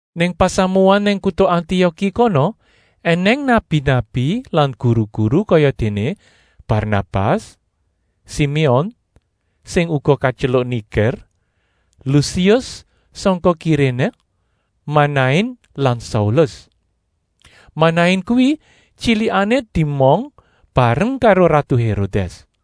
Nang pasamuan nang kuta Antioki kono ènèng nabi-nabi lan guru-guru kayadéné Barnabas, Siméon, sing uga katyeluk Niger, Lusius sangka Kiréné, Manain lan Saulus. Manain kuwi tyilikané diemong bareng karo ratu Hérodès.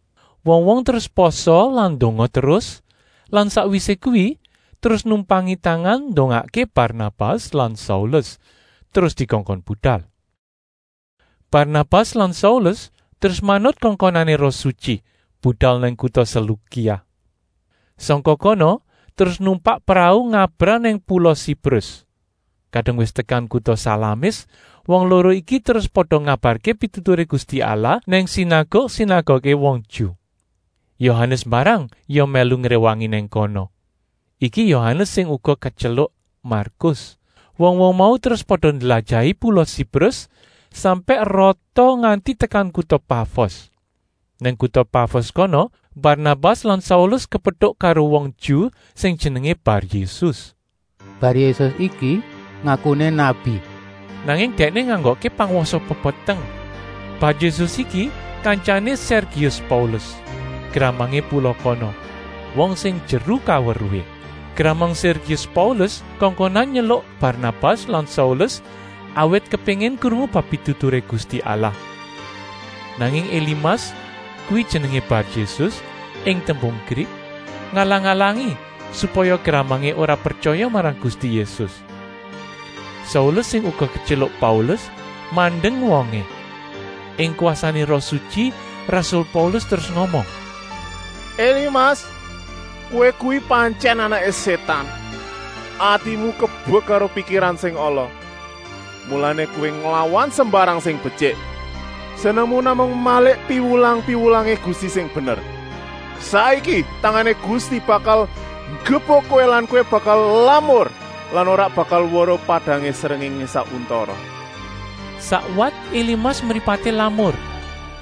Wong-wong terus pasa lan ndonga terus lan sakwisé kuwi terus numpangi tangan ndongakké Barnabas lan Saulus, terus dikongkon budal. Barnabas lan Saulus terus manut kongkonané Roh Sutyi budal nang kuta Selukia. Sangka kono terus numpak prau ngabrah nang pula Siprus. Kadung wis tekan kuta Salamis wong loro iki terus pada ngabarké pituturé Gusti Allah nang sinaguk-sinaguké wong Ju. Yohanes mbarang ya mèlu ngréwangi nang kono. Iki Yohanes sing uga katyeluk Markus. Wong-wong mau terus pada ndlajahi pula Siprus sampèk rata nganti tekan kuta Pafos. Nang kuta Pafos kono Barnabas lan Saulus kepetuk karo wong Ju sing jenengé Bar-Yésus. Bar-Yésus iki ngakuné nabi, nanging dèkné nganggokké pangwasa pepeteng. Bar-Yésus iki kantyané Sèrgius Paulus, gramangé pula kono, wong sing jeru kaweruhé. Gramang Sèrgius Paulus kongkonan nyeluk Barnabas lan Saulus, awit kepéngin krungu bab pituturé Gusti Allah. Nanging Elimas, kuwi jenengé Bar-Yésus ing tembung Grik, ngalang-alangi supaya gramangé ora pretyaya marang Gusti Yésus. Saulus, sing uga ketyeluk Paulus, mandeng wongé. Ing kwasané Roh Sutyi rasul Paulus terus ngomong: “Elimas, kowé kuwi pantyèn anaké Sétan. Atimu kebek karo pikiran sing ala, mulané kowé nglawan sembarang sing betyik. Senengmu namung malik piwulang-piwulangé Gusti sing bener. Saiki tangané Gusti bakal nggebuk kowé lan kowé bakal lamur lan ora bakal weruh padangé srengéngé sak untara.” Sakwat Elimas mripaté lamur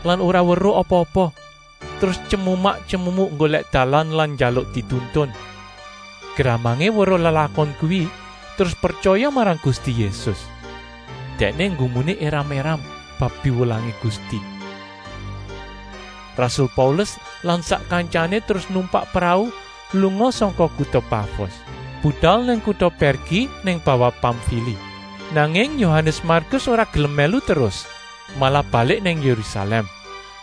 lan ora weruh apa-apa, terus tyemumak-tyemumuk nggolèk dalan lan njaluk dituntun. Gramangé weruh lelakon kuwi terus pretyaya marang Gusti Yésus. Dèkné nggumuné éram-éram bab piwulangé Gusti. Rasul Paulus lan sak kantyané terus numpak prau lunga sangka kuta Pafos, budal nang kuta Pèrgi nang bawah Pamfili. Nanging Yohanes Markus ora gelem mèlu terus, malah balik nang Yérusalèm.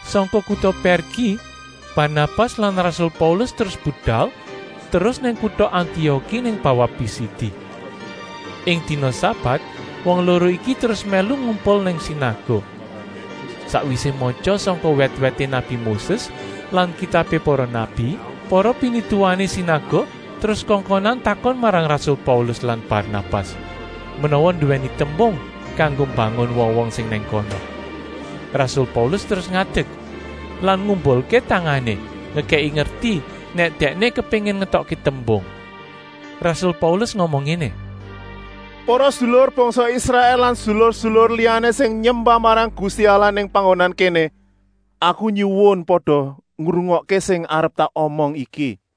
Sangka kuta Pèrgi Barnabas lan rasul Paulus terus budal terus nang kuta Antioki nang bawah Pisidi. Ing dina sabat wong loro iki terus mèlu ngumpul nang sinaguk. Sakwisé matya sangka wèt-wèté nabi Moses lan kitabé para nabi, para pinituwané sinaguk terus kongkonan takon marang rasul Paulus lan Barnabas, menawa nduwèni tembung kanggo mbangun wong-wong sing nang kono. Rasul Paulus terus ngadek lan ngumbulké tangané, ngekèki ngerti nèk dèkné kepéngin ngetokké tembung. Rasul Paulus ngomong ngéné: “Para sedulur bangsa Israèl lan sedulur-sedulur liyané sing nyembah marang Gusti Allah nang panggonan kéné! Aku nyuwun pada ngrungokké sing arep tak omong iki.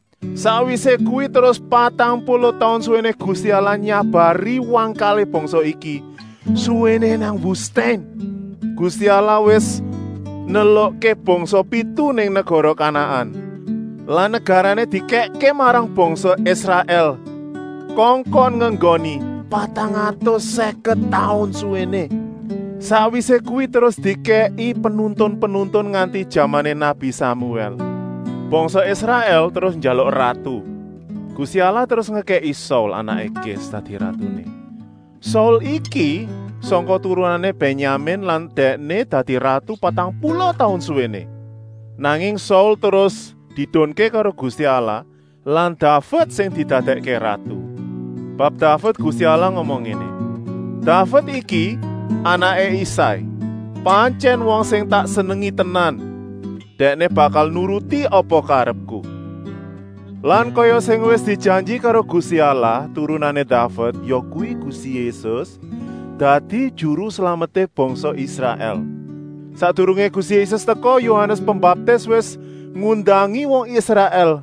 Sakwisé kuwi terus patang puluh taun suwéné Gusti Allah nyabari wangkalé bangsa iki suwéné nang wustèn. Gusti Allah wis nelukké bangsa pitu nang negara Kanaan lan negarané dikèkké marang bangsa Israèl kongkon ngenggoni, patang atus sèket taun suwéné. “Sakwisé kuwi terus dikèki penuntun-penuntun nganti jamané nabi Samuèl. Bangsa Israèl terus njaluk ratu. Gusti Allah terus ngekèki Saul, anaké Kis, dadi ratuné. Saul iki sangka turunané Bènyamin lan dèkné dadi ratu patang puluh taun suwéné. Nanging Saul terus diedunké karo Gusti Allah lan Daved sing didadèkké ratu. Bab Daved Gusti Allah ngomong ngéné: ‘Daved iki, anaké Isai, pantyèn wong sing tak senengi tenan. Dèkné bakal nuruti apa karepku.’ Lan kaya sing wis dijanji karo Gusti Allah, turunané Daved, yakuwi Gusti Yésus, dadi Juru Slameté bangsa Israèl. Sakdurungé Gusti Yésus teka, Yohanes Pembaptis wis ngundangi wong Israèl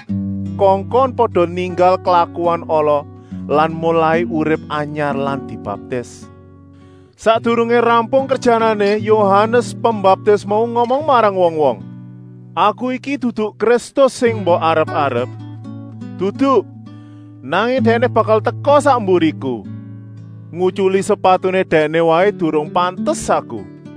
kongkon pada ninggal klakuan ala lan molai urip anyar lan dibaptis. Sakdurungé rampung kerjanané, Yohanes Pembaptis mau ngomong marang wong-wong: ‘Aku iki dudu Kristus sing mbok arep-arep, dudu. Nanging Dèkné bakal teka sak mburiku. Ngutyuli sepatuné Dèkné waé durung pantes aku.’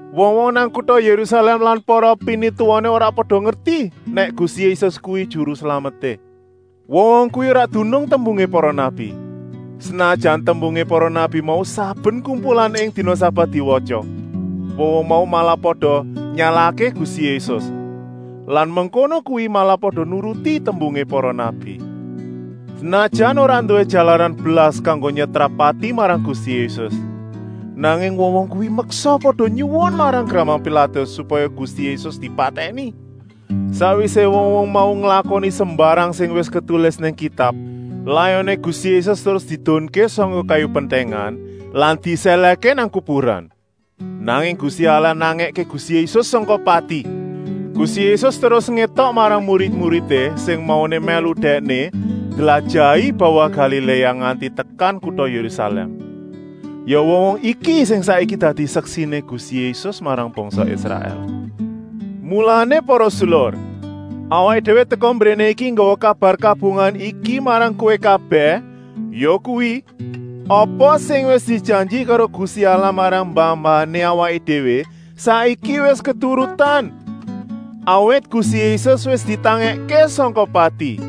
Wong-wong nang kuta Yérusalèm lan para pinituwané ora pada ngerti nèk Gusti Yésus kuwi Juru Slameté. Wong-wong kuwi ora dunung tembungé para nabi, senajan tembungé para nabi mau saben kumpulan ing dina sabat diwatya. Wong-wong mau malah pada nyalahké Gusti Yésus lan mengkono kuwi malah pada nuruti tembungé para nabi. Senajan ora nduwé jalaran blas kanggo nyetrap pati marang Gusti Yésus, nanging wong-wong kuwi meksa pada nyuwun marang gramang Pilatus supaya Gusti Yésus dipatèni. Sakwisé wong-wong mau nglakoni sembarang sing wis ketulis nang Kitab, layoné Gusti Yésus terus diedunké sangka kayu pentèngan lan disèlèhké nang kuburan. Nanging Gusti Allah nangèké Gusti Yésus sangka pati. Gusti Yésus terus ngétok marang murid-muridé sing mauné mèlu Dèkné ndlajahi bawah Galiléa nganti tekan kuta Yérusalèm. Ya wong-wong iki sing saiki dadi seksiné Gusti Yésus marang bangsa Israèl. Mulané para sedulur, awaké déwé teka mbréné iki nggawa kabar kabungahan iki marang kowé kabèh, yakuwi, apa sing wis dijanji karo Gusti Allah marang mbah-mbahané awaké déwé saiki wis keturutan, awit Gusti Yésus wis ditangèkké sangka pati.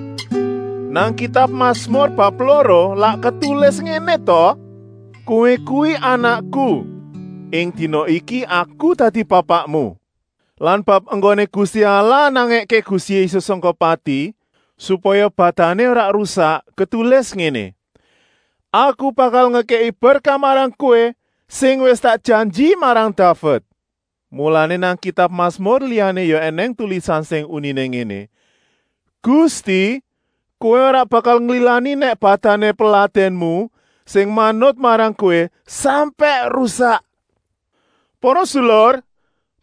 Nang kitab Masmur bab loro lak ketulis ngéné ta: ‘Kowé kuwi Anakku, ing dina iki Aku dadi Bapakmu!’ Lan bab enggoné Gusti Allah nangèké Gusti Yésus sangka pati, supaya badané ora rusak, ketulis ngéné: ‘Aku bakal ngekèki berkah marang kowé sing wis tak janji marang Daved!’ Mulané nang kitab Masmur liyané ya ènèng tulisan sing uniné ngéné: ‘Gusti, Kowé ora bakal nglilani nèk badané peladènmu, sing manut marang Kowé, sampèk rusak.’ Para sedulur,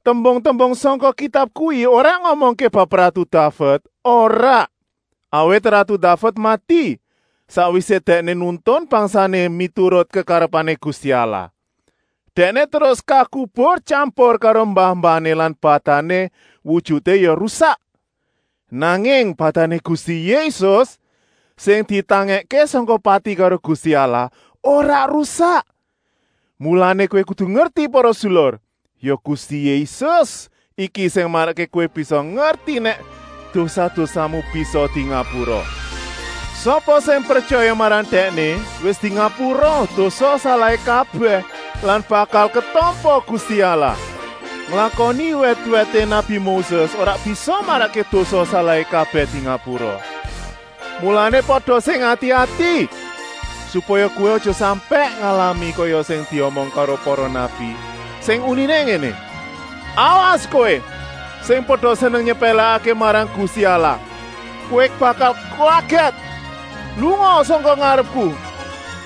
tembung-tembung sangka Kitab kuwi ora ngomongké bab ratu Daved, ora. Awit ratu Daved mati, sakwisé dèkné nuntun bangsané miturut kekarepané Gusti Allah. Dèkné terus kakubur tyampur karo mbah-mbahané lan badané wujuté ya rusak. Nanging badané Gusti Yésus, sing ditangèkké sangka pati karo Gusti Allah, ora rusak. Mulané kowé kudu ngerti para sedulur, ya Gusti Yésus iki sing marakké kowé bisa ngerti nèk dosa-dosamu bisa dingapura. Sapa sing pretyaya marang Dèkné wis dingapura dosa-salahé kabèh lan bakal ketampa Gusti Allah. Nglakoni wèt-wèté nabi Moses ora bisa marakké dosa-salahé kabèh dingapura. Mulané pada sing ati-ati, supaya kowé aja sampèk ngalami kaya sing diomong karo para nabi, sing uniné ngéné: ‘Awas kowé, sing pada seneng nyepèlèkké marang Gusti Allah. Kowé bakal kagèt. Lungaa sangka ngarepku.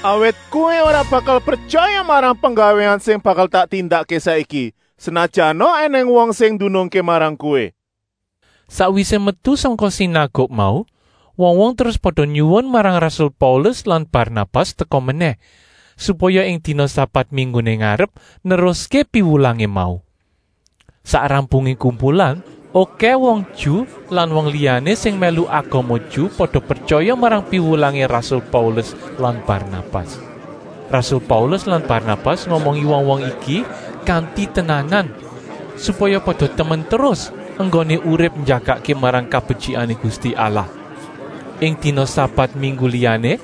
Awit kowé ora bakal pretyaya marang penggawéan sing bakal tak tindakké saiki, senajana ènèng wong sing ndunungké marang kowé!’” Sakwisé metu sangka sinaguk mau wong-wong terus pada nyuwun marang rasul Paulus lan Barnabas teka menèh, supaya ing dina sabat mingguné ngarep neruské piwulangé mau. Sak rampungé kumpulan okèh wong Ju lan wong liyané sing mèlu agama Ju pada pretyaya marang piwulangé rasul Paulus lan Barnabas. Rasul Paulus lan Barnabas ngomongi wong-wong iki kanti tenanan, supaya pada temen terus enggoné urip njagakké marang kabetyikané Gusti Allah. Ing dina sabat minggu liyané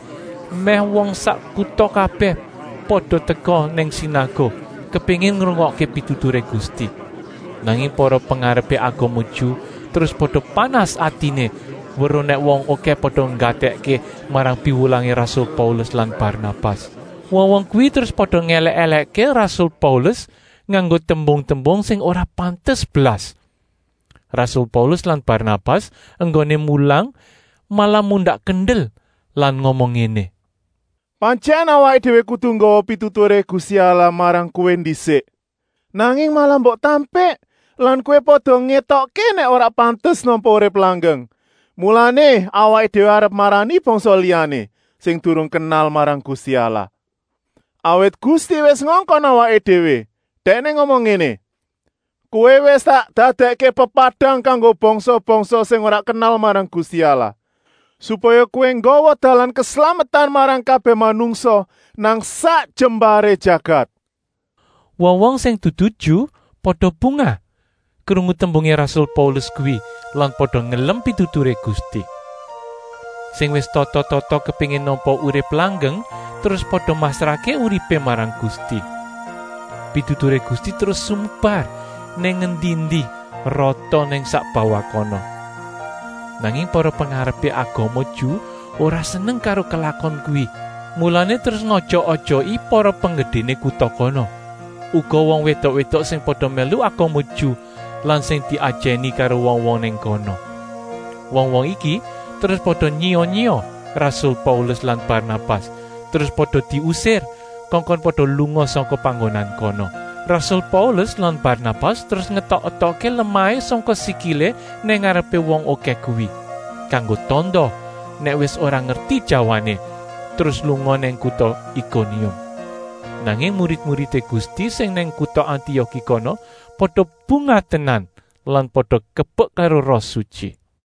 mèh wong sak kuta kabèh pada teka nang sinaguk, kepéngin ngrungokké pituturé Gusti. Nanging para pengarepé agama Ju terus pada panas atiné weruh nèk wong okèh pada nggatèkké marang piwulangé rasul Paulus lan Barnabas. Wong-wong kuwi terus pada ngèlèk-èlèkké rasul Paulus nganggo tembung-tembung sing ora pantes blas. Rasul Paulus lan Barnabas enggoné mulang malah mundak kendel lan ngomong ngéné: “Pantyèn awaké déwé kudu nggawa pituturé Gusti Allah marang kowé ndisik. Nanging malah mbok tampik lan kowé pada ngétokké nèk ora pantes nampa urip langgeng, mulané awaké déwé arep marani bangsa liyané, sing durung kenal marang Gusti Allah. Awit Gusti wis ngongkon awaké déwé, Dèkné ngomong ngéné: ‘Kowé wis tak dadèkké pepadang kanggo bangsa-bangsa sing ora kenal marang Gusti Allah, supaya kowé nggawa dalan keslametan marang kabèh manungsa nang sak jembaré jagat.’” Wong-wong sing dudu Ju pada bungah krungu tembungé rasul Paulus kuwi lan pada ngelem pituturé Gusti. Sing wis tata-tata kepéngin nampa urip langgeng terus pada masrahké uripé marang Gusti. Pituturé Gusti terus sumebar nang endi-endi, rata nang sak bawah kono. Nanging para pengarepé agama Ju ora seneng karo lelakon kuwi, mulané terus ngojok-ojoki para penggedéné kuta kono, uga wong wédok-wédok sing pada mèlu agama Ju lan sing diajèni karo wong-wong nang kono. Wong-wong iki terus pada nyiya-nyiya rasul Paulus lan Barnabas terus pada diusir kongkon pada lunga sangka panggonan kono. Rasul Paulus lan Barnabas terus ngetok-etokké lemahé sangka sikilé nang ngarepé wong okèh kuwi, kanggo tanda nèk wis ora ngerti jawané, terus lunga nang kuta Ikonium. Nanging murid-muridé Gusti sing nang kuta Antioki kono pada bungah tenan lan pada kebek karo Roh Sutyi.